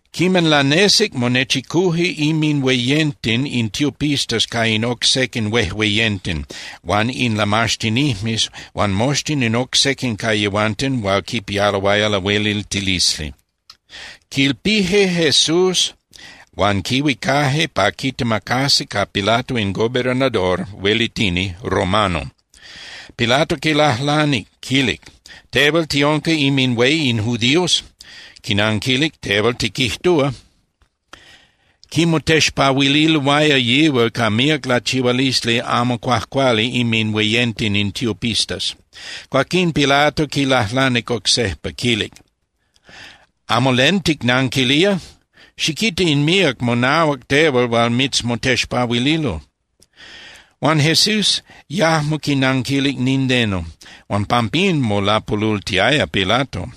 Quiman lanesic, monechicuje inminhueyenten in tiopistas ca in oc sequin huejueyenten huan in lamaxtinijmes huan moxtin in oc sequin ca yehuanten hual quipialoaya lahueliltilisli. Quilpije Jesús huan quihuicaje pa quitemacasi ca Pilato in gobernador (huelitini) romano. Pilato quilajlanic, quilic: —Tehual ¿tiunca inminhué in judíos? Quinanquilic: —Tehual tiquijtúa. Quimotexpahuililoaya yihual ca míac lachihualisli amo cuajcuali inminhueyenten in tiopistas. Cuaquín Pilato quilajlanic oc sejpa, quilic: —¿Amo len ticnanquilía? Xiquita in míac monahuac tehual hual mitzmotexpahuililo. Huan Jesús yajmo quinanquilic nindeno, huan pampín molapolultiaya Pilato.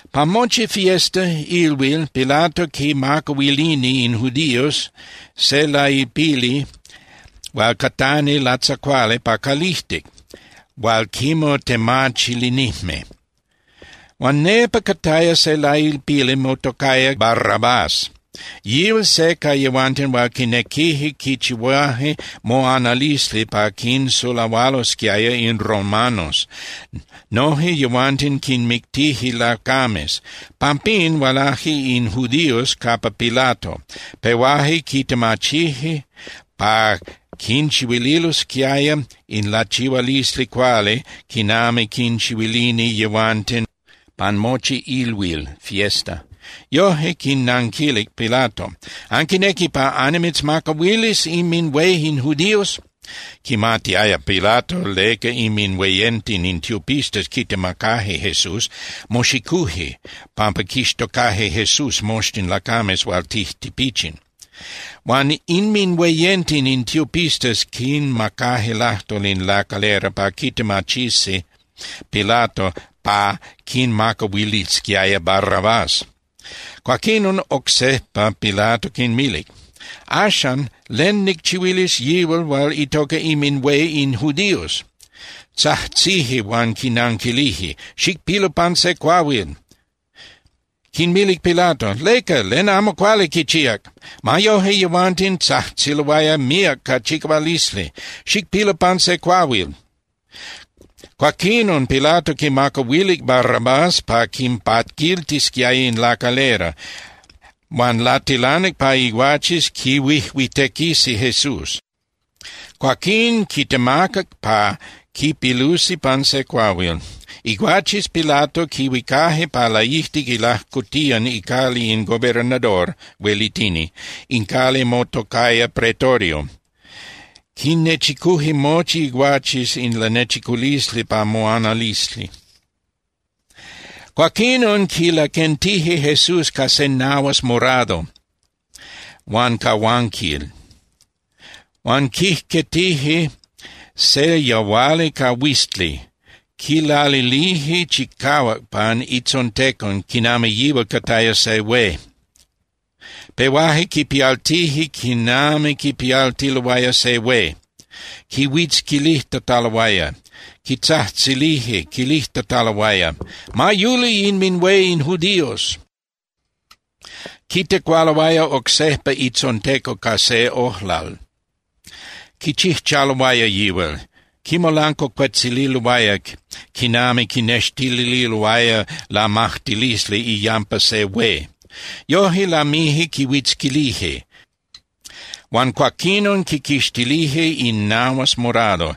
Pan mochi fiesta (ilhuil) Pilato quinmacahuilini in judíos se lailpili hual catani latzacuali pa calijtic hual quimotemachilinijme. Huan nepa cataya se lailpili motocaya Barrabás. Yihual se ca yehuanten hual quinequije quichihuaje moanalisli pa quinsulahualosquiaya in romanos, noje yehuanten quinmictije lacames. Pampín hualaje in judíos capa Pilato, pehuaje quitemachije pa quinchihuililosquiaya in lachihualisli cuali quinami quinchihuilini yehuanten pan mochi ilhuil (fiesta). Yoje quinnanquilic Pilato: —¿Anquinequi pa annimitzmacahuilis inminhué in judíos? Quimatiaya Pilato leca inminhueyenten in tiopistas quitemacaje Jesús. Moxicuje pampa quixtocaje Jesús moxtin lacames hual tijtipichin. Huan inminhueyenten in tiopistas quinmacaje lajtol in lacalera pa quitemachisi Pilato pa quinmacahuilisquiaya Barrabás. Cuaquinon oc sejpa Pilato quinmilic: —Axan, ¿len nicchihuilis yihual hual itoca inminhué in judíos? Tzajtzije huan quinanquilije: —¡Xicpilu pan se cuahuil! Quinmilic Pilato: —¿Leca? ¿Len amo cuali quichíac? Ma yoje, yehuanten tzajtziloaya míac ca chicahualisli: —¡Xicpilu pan se cuahuil! Cuaquinon Pilato quinmacahuilic Barrabás pa quinpaquiltisquiaya in lacalera huan latilanic pa iguaches quihuijuitequisi Jesús. Cuaquín quitemacac pa quipilusi pan se cuahuil. Iguaches Pilato quihuicaje pa laijtic ilajcotiyan icali in gobernador (huelitini). In cali motocaya Pretorio. Quinnechicuje mochi iguaches in lanechiculisli pa moanalisli. Cuaquinon quilaquentije Jesús ca se nahuas morado huan cahuanquil. Huan quijquetije se yahuali ca huizli. Quilalilije chicahuac pan itzontecon quinami yihual cataya se hué. Pehuaje quipialtije quinami quipialtiloaya se hué, quihuitzquilijtataloaya. Quitzajtzilije quilijtataloaya: —¡Ma yuli inminhué in judíos! Quitecualoaya oc sejpa itzontecon ca se ojlal, quichijchaloaya yihual. Quimolancuacuetzililoaya quinami quinextililoaya lamajtilisli iyampa se hué. Yoje lamije quihuitzquilije, huan cuaquinon quiquixtilije in nahuas morado,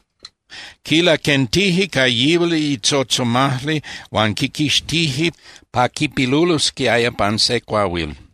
quilaquentije ca yihual itzotzomajli huan quiquixtije pa quipilulosquiaya pan se cuahuil.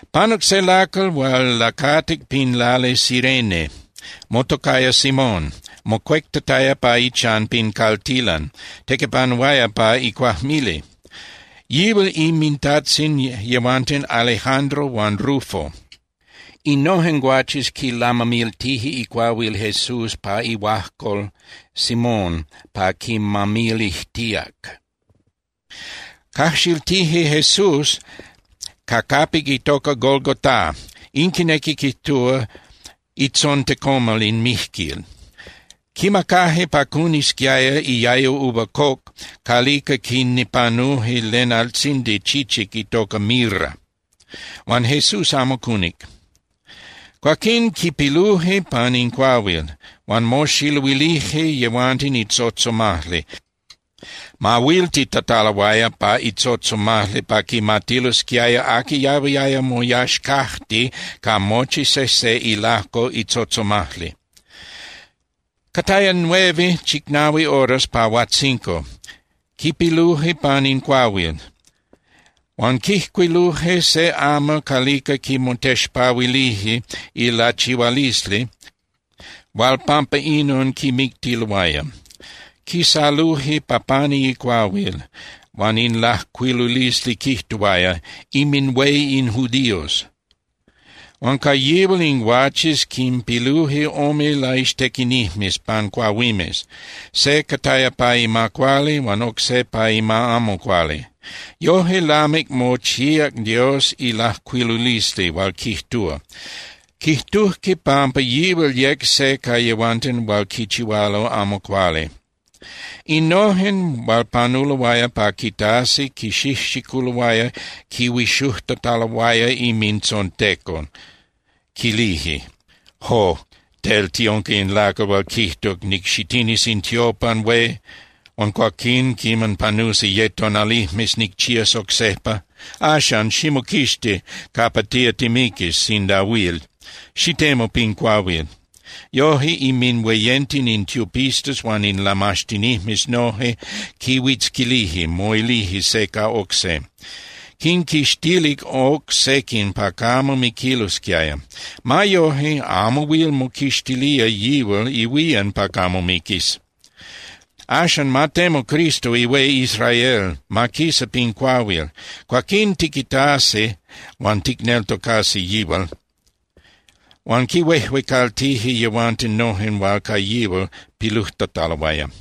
Panuc se lacal hual lacatic pin lali Cirene, motocaya Simón, mocuectataya pa ichan pin caltilan, tequipanuaya pa icuajmili. Yihual inmintajtzin yehuanten Alejandro huan Rufo. Innojen guaches quilamamiltije icuahuil Jesús pa ihuajcol Simón pa quimamilijtíac. Cajxiltije Jesús ca capic itoca Golgotá, in quinequi quijtúa Itzontecomal in mijquil. Quimacaje pa cunisquiaya iayo uva coc calica quinipanuje len altzindi chichic itoca mirra, huan Jesús amo cunic. Cuaquín quipiluje pan in cuahuil, huan moxiluilije yehuanten itzotzomajli, mahuiltitataloaya pa itzotzomajli pa quimatilosquiaya aqui yahuiaya moyaxcajti ca mochi sejse ilajco itzotzomajli. Cataya nueve (chicnahui) horas pa huajtzinco quipiluje pan in cuahuil. Huan quijcuiluje se amal calica quimotexpahuilije ilachihualisli hual pampa inon quimictiloaya. Quisaluje pa pani icuahuil, huan in lajcuilulisli quijtuaya: “INMINHUÉ IN JUDÍOS”. Huan ca yihual in guaches quinpiluje ome laixtequinijmes pan cuahuimes, se cataya pa ima cuali huan oc se pa ima amo cuali. Yoje lamic mochíac Dios ilajcuilulisli hual quijtúa: “Quijtujque pampa yihual yec se ca yehuanten hual quichihualo amo cuali.” Innojen hual panuloaya pa quitasi quixijxiculoaya quihuixujtataloaya inmintzontecon, quilije: —¡Jo! Tel tiunca in lacal hual quijtuc: “Nicxitinis in tiopan hué huan cuaquín quiman panusi ye tonalijmes nicchías oc sejpa.” Axan, ximoquixti capa tía timiquis sinda huil, xitemu pin cuahuil. Yoje inminhueyenten in tiopistas huan in lamaxtinijmes noje quihuitzquilije, moilije se ca oc se: —Quinquixtilic oc sequin pa camo miquilosquiaya. Ma yoje, amo huil moquixtilía yihual ihuían pa camo miquis. Axan, ma temu Cristo ihué Israel, ma quisa pin cuahuil. Cuaquín tiquitasi huan ticneltocasi yihual. Huan quihuejuecaltije yehuanten noje hual ca yihual pilujtataloaya.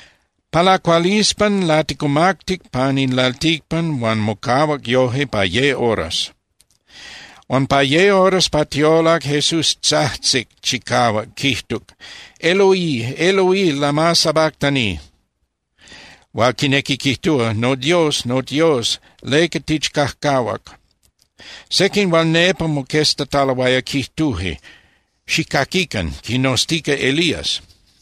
Pa lacualispan laticumactic pan in lalticpan huan mocahuac yoje pa ye horas. Huan pa ye horas pa tiolac Jesús tzajtzic chicahuac, quijtuc: —¡Eloí, Eloí! ¿Lama sabactani? —hual quinequi quijtúa: ¡NoDios, noDios! ¿Leca tichcajcahuac? Sequin hual nepa moqueztataloaya quijtuje: —Xijcaquican, quinoztica Elías.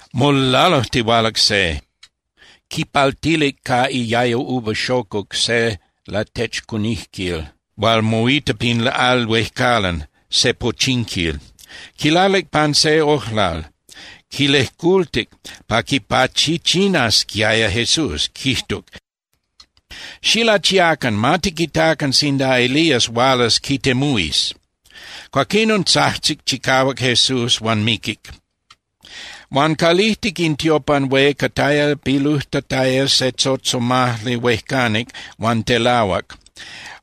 Molalujtihualac se, quipaltilic ca iayo uva xocuc se latechcunijquil hual moita pin al huejcalan, se pochinquil. Quilalic pan se ojlal, quilejcultic pa quipachichinasquiaya Jesús, quijtuc: —Xilachiacan. Ma tiquitacan sinda Elías hualas quitemuhuis. Cuaquinon tzajtzic chicahuac Jesús huan miquic. Huan calijtic in tiopan hué cataya pilujtataya se tzotzomajli huejcanic huan telahuac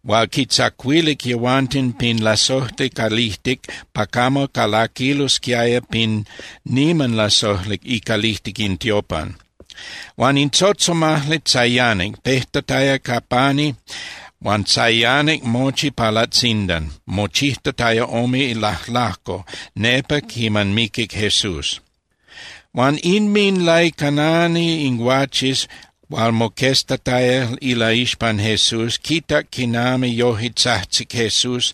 hual quitzacuilic yehuanten pin lasojli calijtic pa camo calaquilosquiaya pin niman lasojli icalijtic in tiopan. Huan in tzotzomajli tzayanic, pejtataya ca pani huan tzayanic mochi pa latzindan, mochijtataya ome lajlajco nepa quiman miquic Jesús. Huan inminlaicanani in guaches hual moqueztataya ilaixpan Jesús quitac quinami yoje tzajtzic Jesús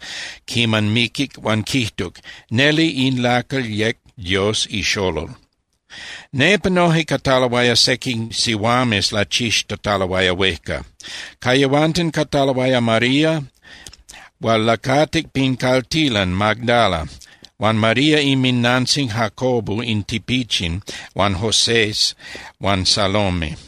quiman miquic huan quijtuc: —Neli in lacal yec Dios ixolol. Nepa noje cataloaya sequin sihuames lachixtataloaya huejca. Ca yehuanten cataloaya María hual lacatic pin caltilan Magdala, huan María inminnantzin Jacobo in Tipichin huan Josés, huan Salome.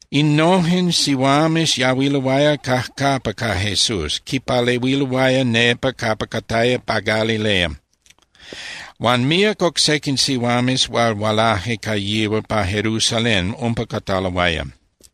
Innojen sihuames yahuiloaya cajcapa ca Jesús, quipalehuiloaya nepa capa cataya pa Galilea. Huan míac oc sequin sihuames hual hualaje ca yihual pa Jerusalén umpa cataloaya.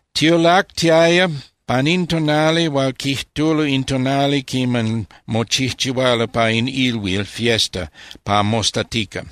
Tiolactiaya pan in tonali hual quijtulo in tonali quiman mochijchihualo pa in ilhuil (fiesta) pa mostatica.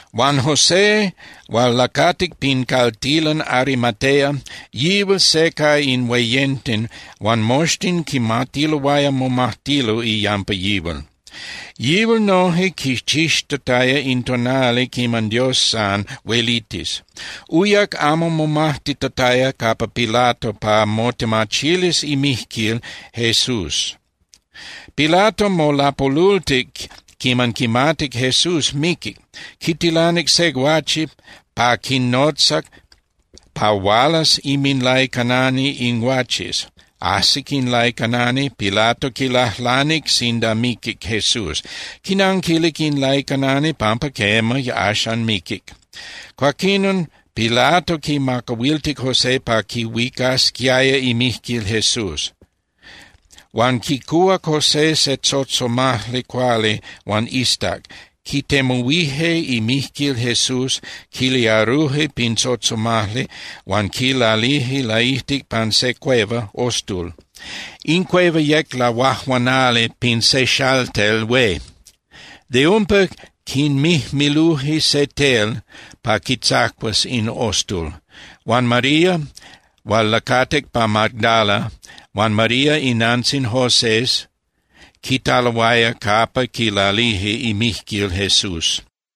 Huan José hual lacatic pin caltilan Arimatea, yihual se ca in hueyenten huan moxtin quimatiloaya momajtilo iyampa yihual. Yihual noje quichixtataya in tonali quiman Dios san huelitis. Uyac amo momajtitataya capa Pilato pa motemachilis imijquil Jesús. Pilato molapolultic quiman quimatic Jesús miquic. Quitilanic se guache pa quinotzac pa hualas inminlaicanani in guaches. Ajsic in laicanani, Pilato quilajlanic sinda miquic Jesús. Quinanquilic in laicanani pampa quema, axan miquic. Cuaquinon Pilato quimacahuiltic José pa quihuicasquiaya imijquil Jesús. Huan quicuhuac José se tzotzomajli cuali huan iztac, quitemuhuije imijquil Jesús, quiliaruje pin tzotzomajli huan quilalije laijtic pan se cueva (ostul). In cueva yec lahuajuanali pin se xaltel hué. De umpa quimijmiluje se tel pa quitzacuas in ostul. Huan María hual lacatic pa Magdala huan María inantzin Josés quitaloaya capa quilalije imijquil Jesús.